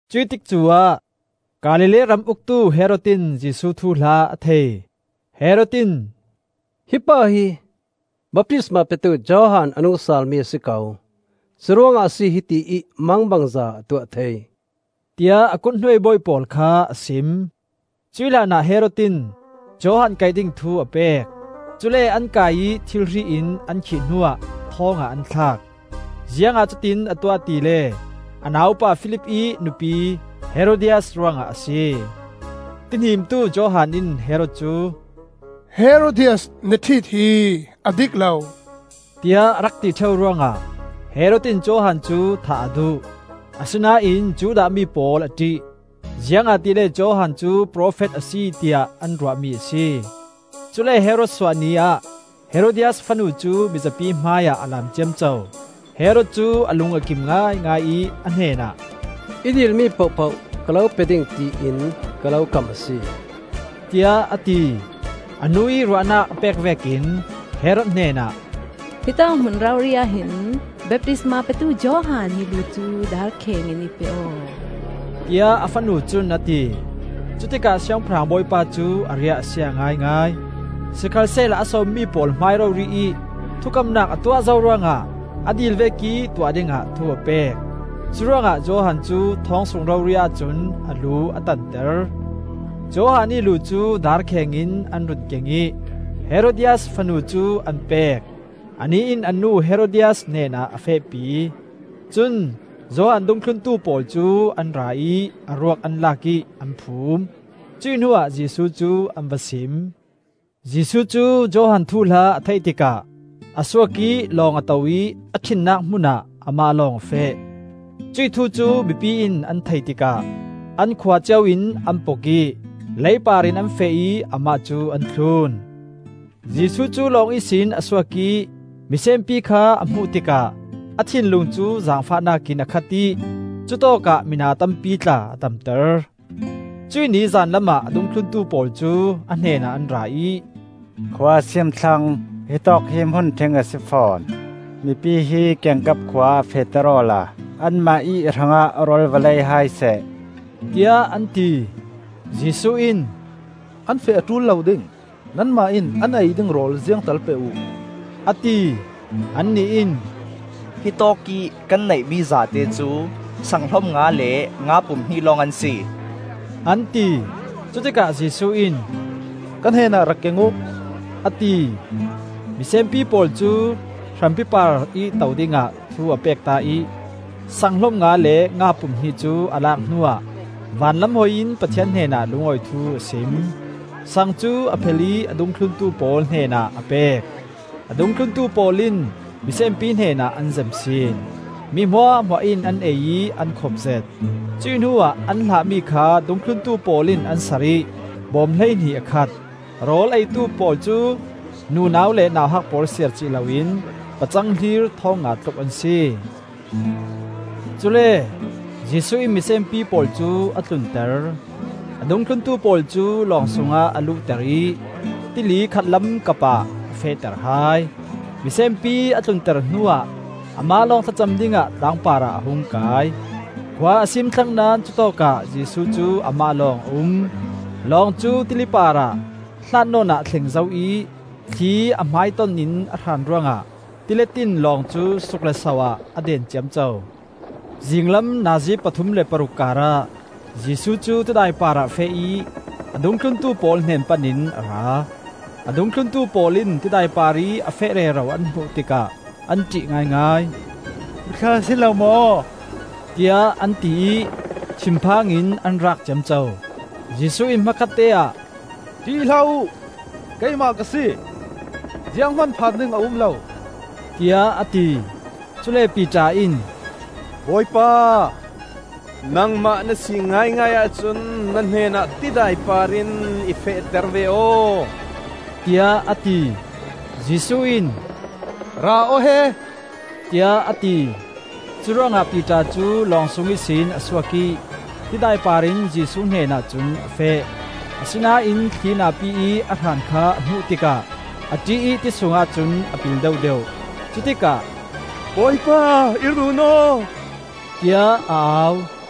Cuih tikcu ah Galilee ram uktu Herod in Jesuh thuhla a thei. Herod in, “Hi pa hi baptisma petu Johan a nung salmi a si ko. Cu ruangah a si hiti ih mangbangza a tuah thei,” tiah a kut hnuai bawi pawl kha a sim. Cuih hlanah Herod in Johan kaih ding thu a pek; cule an kai ih thirhri in an khih hnuah thawng ah an thlak. Ziangah cutiin a tuah tile a naupa Filip ih nupi Herodias ruangah a si. Tihnimtu Johan in Herod cu, “Herodias na ṭhit hi a dik lo,” tiah a rak ti ṭheu ruangah, Herod in Johan cu thah a duh, asinain Judah mi pawl a ṭih, ziangahtile Johan cu profet a si tiah an ruahmi a si. Cule Herod suah ni ah Herodias fanu cu mizapi hmaiah a laam ciamco. Herod cu a lung a kim ngaingai ih a hnenah, “I dil mi pohpoh ka lo pe ding tiin ka lo kam a si,” tiah a ti. A nu ih ruahnak a pek vekin Herod hnenah, “Hitawk hmun rori ahhin baptistma petu Johan ih lu cu darkheng in i pe aw,” tiah a fanu cun a ti. Cutikah Siangpahrang bawipa cu a riah a sia ngaingai. Sikhalsehla a sawmmi pawl hmai rori ih thukamnak a tuah zo ruangah a dil vekih tuah dingah thu a pek. Curuangah Johan cu thawng sung rori ahcun a lu a tanter. Johan ih lu cu darkheng in an run keng ih Herodias fanu cu an pek; anih in a nu Herodias hnenah a fehpi. Cun Johan dungthluntu pawl cu an ra ih a ruak an lak ih an phum; cuih hnuah Jesuh cu an va sim. Jesuh cu Johan thuhla a theih tikah a suak ih lawng a to ih a ṭhinnak hmun ah amah lawng a feh. Cuih thu cu mipi in an theih tikah an khua cio in an pok ih lei par in an feh ih amah cu an thlun. Jesuh cu lawng ihsin a suak ih misenpi kha a hmuh tikah a thinlung cu zaangfahnak in a khat ih cutawkah mina tampi tla a damter. Cuih ni zanlam ah a dungthluntu pawl cu a hnenah an ra ih, “Khua a siim thlang, hitawk hi hmun ṭhing a si fawn. Mipi hi kiangkap khua ah fehter awla anmah ih hrangah rawl va lei hai seh,” tiah an ti. Jesuh in, “An feh a ṭul lo ding; nanmah in an ei ding rawl ziangtal pe uh,” a ti. Annih in, “Hitawkih kan neihmi zate cu sanghlom nga le nga pum hnih lawng an si,” an ti. Cutikah Jesuh in, “Ka hnenah rak keng uh,” a ti. Misenpi pawl cu hrampi parih to dingah thu a pekta ih saang hlom nga le nga pum hnih cu a lak hnuah van lam hoi in Pathian hnenah lungawi thu a sim. saang cu a phel ih a dungthlun pawl hnenah a pek; a dungthlun pawl in misenpi hnenah an zem sin. Mi hmuahhmuah in an ei ih an khopzet. Cuih hnuah an hlahmi kha dungthluntu pawl in an sar ih bawm hleihnih a khat. Rawl a eitu pawl cu nunau le nauhak pawl siar cih loin pacang hlir thawng nga tluk an si. Cule Jesuh in misenpi pawl cu a tlunter. A dungthluntu pawl cu lawng sungah a luhter ih tili khatlam kapah a fehter hai. Misenpi a tlunter hnuah amah lawng thlacam dingah tlang parah a hung kai. Khua a siim thlang naón cutawkah Jesuh cu amah lawng a um. Long cu tili parah hlat nawn a thleng zo ih thli a hmaiton in a hraan ruangah tilet in lawng cu suk le so ah a den ciamco. Zinglam nazi pathum le paruk karah Jesuh cu tidai parah a feh ih a dungthluntu pawl hnen pan in a ra. A dungthluntu pawl in tidai parih a feh rero an hmuh tikah an ṭih ngaingai. “Muthla a si lo maw?” tiah an ti ih thinphang in an raak ciamco. Jesuh in hmakhatte ah, “ṭih hlah uh! Keimah ka si! Zianghman phan ding a um lo,” tiah a ti. Cule Piter in, “Bawipa, nangmah na si ngaingai ahcun na hnenah tidai parin i fehter ve aw,” tiah a ti. Jesuh in, “Ra aw he,” tiah a ti. Curuangah Piter cu lawng sung ihsin a suak ih tidai par in Jesuh hnenah cun a feh. Asinain thli na pi ih a hran kha a hmuh tikah a ṭih ih ti sungah cun a pil deuhdeuh. Cutikah, “Bawipa, i run aw!” tiah a au.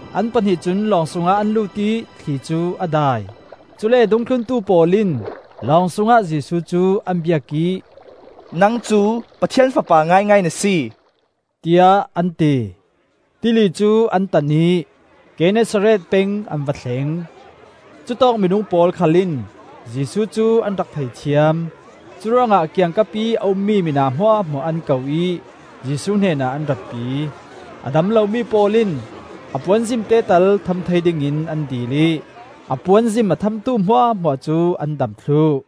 An pahnih cun lawng sungah an lut ih thli cu a dai. Cule dungthluntu pawl in lawng sungah Jesuh cu an biak ih, “Nang cu Pathian Fapa ngaingai na si,” tiah an ti. Tili cu an tan ih Gennesaret peng an va thleng. Cutawk minung pawl khal in Jesuh cu an rak thei thiam. Curuangah kiangkapih a ummi mina hmuahhmuah an ko ih Jesuh hnenah an ratpi. A dam lomi pawl in a puanzim tetal tham thei dingin an dil ih a puanzim a thamtu hmuahhmuah cu an dam thluh.